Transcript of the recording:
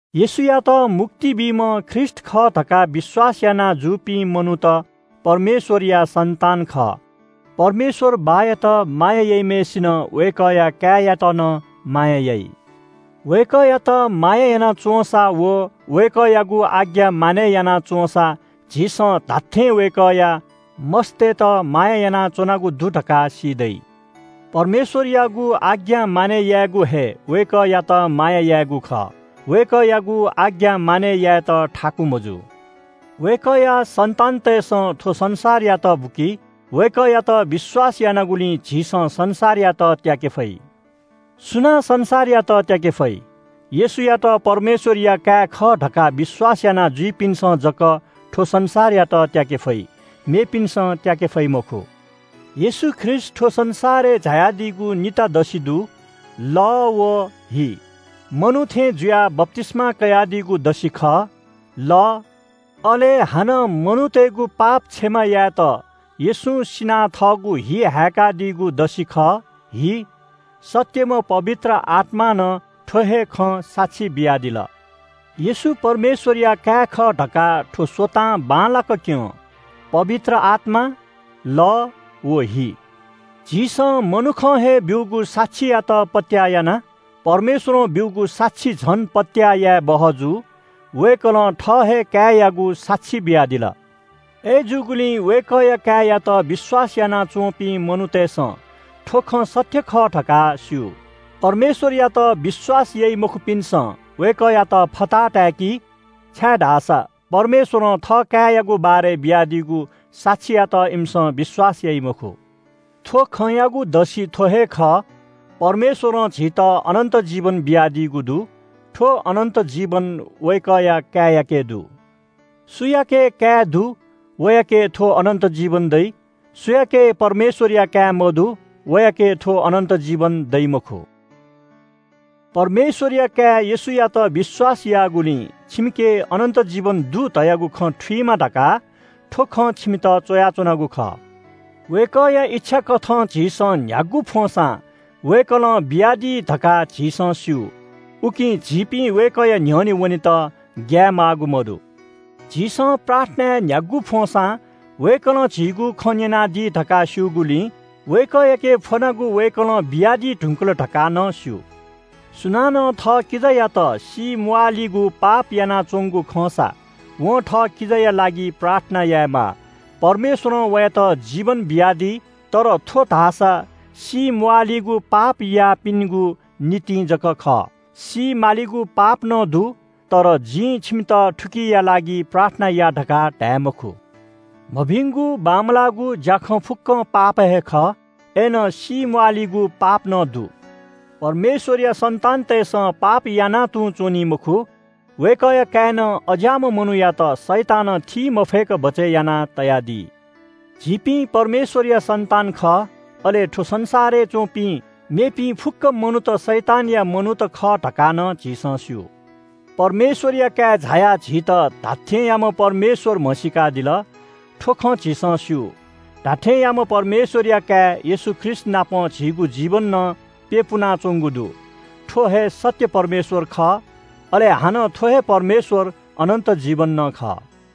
येशूयात मुक्ति बीम्‍ह ख्रीष्‍ट खः धकाः विश्‍वास याना जूपिं मनूत परमेश्‍वरया सन्‍तान खः। परमेश्‍वर बाःयात माया याइम्‍हय्‌सिनं वय्‌कःया काय्‌यात नं माया याइ। वय्‌कःयात माया याना च्‍वंसा व वय्‌कःयागु आज्ञा मानय् याना च्‍वंसा झीसं धात्‍थें वय्‌कःया मस्‍तय्‌त माया यानाच्‍वनागु दु धकाः सी दइ। परमेश्‍वरयागु आज्ञा मानय् यायेगु हे वय्‌कःयात माया यायेगु खः। वय्‌कःयागु आज्ञा मानय् यायेत थाकु मजू। वय्‌कःया सन्‍तानतय्‌सं थ्‍व संसारयात बुकी। वय्‌कःयात विश्‍वास यानागुलिं झीसं संसारयात त्‍याके फइ। सुनां संसारयात त्‍याके फइ? येशूयात परमेश्‍वरया काय् खः धकाः विश्‍वास यानाजुइपिन्‍सं जक थ्‍व संसारयात त्‍याके फइ, मेपिन्‍सं त्‍याके फइ मखु। येशू ख्रीष्‍ट थ्‍व संसारय् झायादीगु निता दसि दु – लः व हि। मनू थें जुयाः बप्‍तिस्‍मा कयादीगु दसि खः – लः, अले हानं मनूतय्‌गु पाप क्षमा यायेत येशूं सिनाः थःगु हि हाय्‌कादीगु दसि खः – हि। सत्‍यम्‍ह पवित्र आत्‍मां नं थ्‍व हे खँ साक्षी बियादिल। येशू परमेश्‍वरया काय् खः धकाः थ्‍व स्‍वतां बांलाक क्‍यं – पवित्र आत्‍मा, लः व हि। झीसं मनुखं हे ब्‍यूगु साक्षीयात पत्‍याः याना। परमेश्‍वरं ब्‍यूगु साक्षी झन पत्‍याः यायेबहः जू। वय्‌कलं थः हे काय्‌यागु साक्षी बियादिल। अय्‌जूगुलिं वय्‌कःया काय्‌यात विश्‍वास यानाच्‍वंपिं मनूतय्‌सं थ्‍व खँ सत्‍य खः धकाः स्‍यू। परमेश्‍वरयात विश्‍वास याइ मखुपिन्‍सं वय्‌कःयात फताहा ताय्‌की, छाय्‌धाःसा परमेश्‍वरं थः काय्‌यागु बारे बियादीगु साक्षीयात इमिसं विश्‍वास याइ मखु। थ्‍व खँयागु दसि थ्‍व हे खः – परमेश्‍वरं झीत अनन्‍त जीवन बियादीगु दु। थ्‍व अनन्‍त जीवन वय्‌कःया काय्‌याके दु। सुयाके काय् दु वयाके थ्‍व अनन्‍त जीवन दइ, सुयाके परमेश्‍वरया काय् मदु वयाके थ्‍व अनन्‍त जीवन दइ मखु। परमेश्‍वरया काय् येशूयात विश्‍वास याःगुलिं छिमिके अनन्‍त जीवन दु धयागु खँ थुइमा धकाः थ्‍व खँ छिमित च्‍वयाच्‍वनागु खः। वय्‌कःया इच्‍छा कथं झीसं न्‍ह्यागु फ्‍वंसां वय्‌कलं बियादी धकाः झीसं स्‍यू। उकिं झीपिं वय्‌कःया न्‍ह्यःने वनेत ग्‍याये माःगु मदु। झीसं प्रार्थनाय् न्‍ह्यागु फ्‍वंसां वय्‌कलं झीगु खँ न्‍यनादी धकाः स्‍यूगुलिं वय्‌कःयाके फ्‍वनागु वय्‌कलं बियादी धुंकल धकाः नं स्‍यू। सुनानं थः किजायात सीम्‍वाःलिगु पाप यानाच्‍वंगु खंसा वं थः किजायालागिं प्रार्थना यायेमाः। परमेश्‍वरं वयात जीवन बियादी। तर थ्‍व धाःसा सीम्‍वाःलिगु पाप याःपिनिगु निंतिं जक खः। सी मालिगु पाप नं दु। तर जिं छिमित थुकिया लागि प्रार्थना या धकाः धाये मखु। मभिगुं बांमलाःगु ज्‍याखँ फुक्‍कं पाप हे खः। अय्‌नं सीम्‍वाःलिगु पाप नं दु। परमेश्‍वरया सन्‍तानतय्‌सं पाप यानां तुं च्‍वनी मखु। वय्‌कःया काय्‌नं अज्‍याःम्‍ह मनूयात शैतानं थी मफय्‌क बचय् यानातयादी। झीपिं परमेश्‍वरया सन्‍तान खः, अले थ्‍व संसारय् च्‍वंपिं मेपिं फुक्‍क मनूत शैतानया मनूत खः धकाः नं झीसं स्‍यू। परमेश्‍वरया काय् झायाः झीत धात्‍थेंयाम्‍ह परमेश्‍वर म्‍हसीकादिल। थ्‍व खँ झीसं स्‍यू। धात्‍थेंयाम्‍ह परमेश्‍वरया काय् येशू ख्रीष्‍टनाप झीगु जीवन नं प्‍यपुनाच्‍वंगु दु। थ्‍व हे सत्‍य परमेश्‍वर खः, अले हानं थ्‍व हे परमेश्‍वर अनन्‍त जीवन नं खः।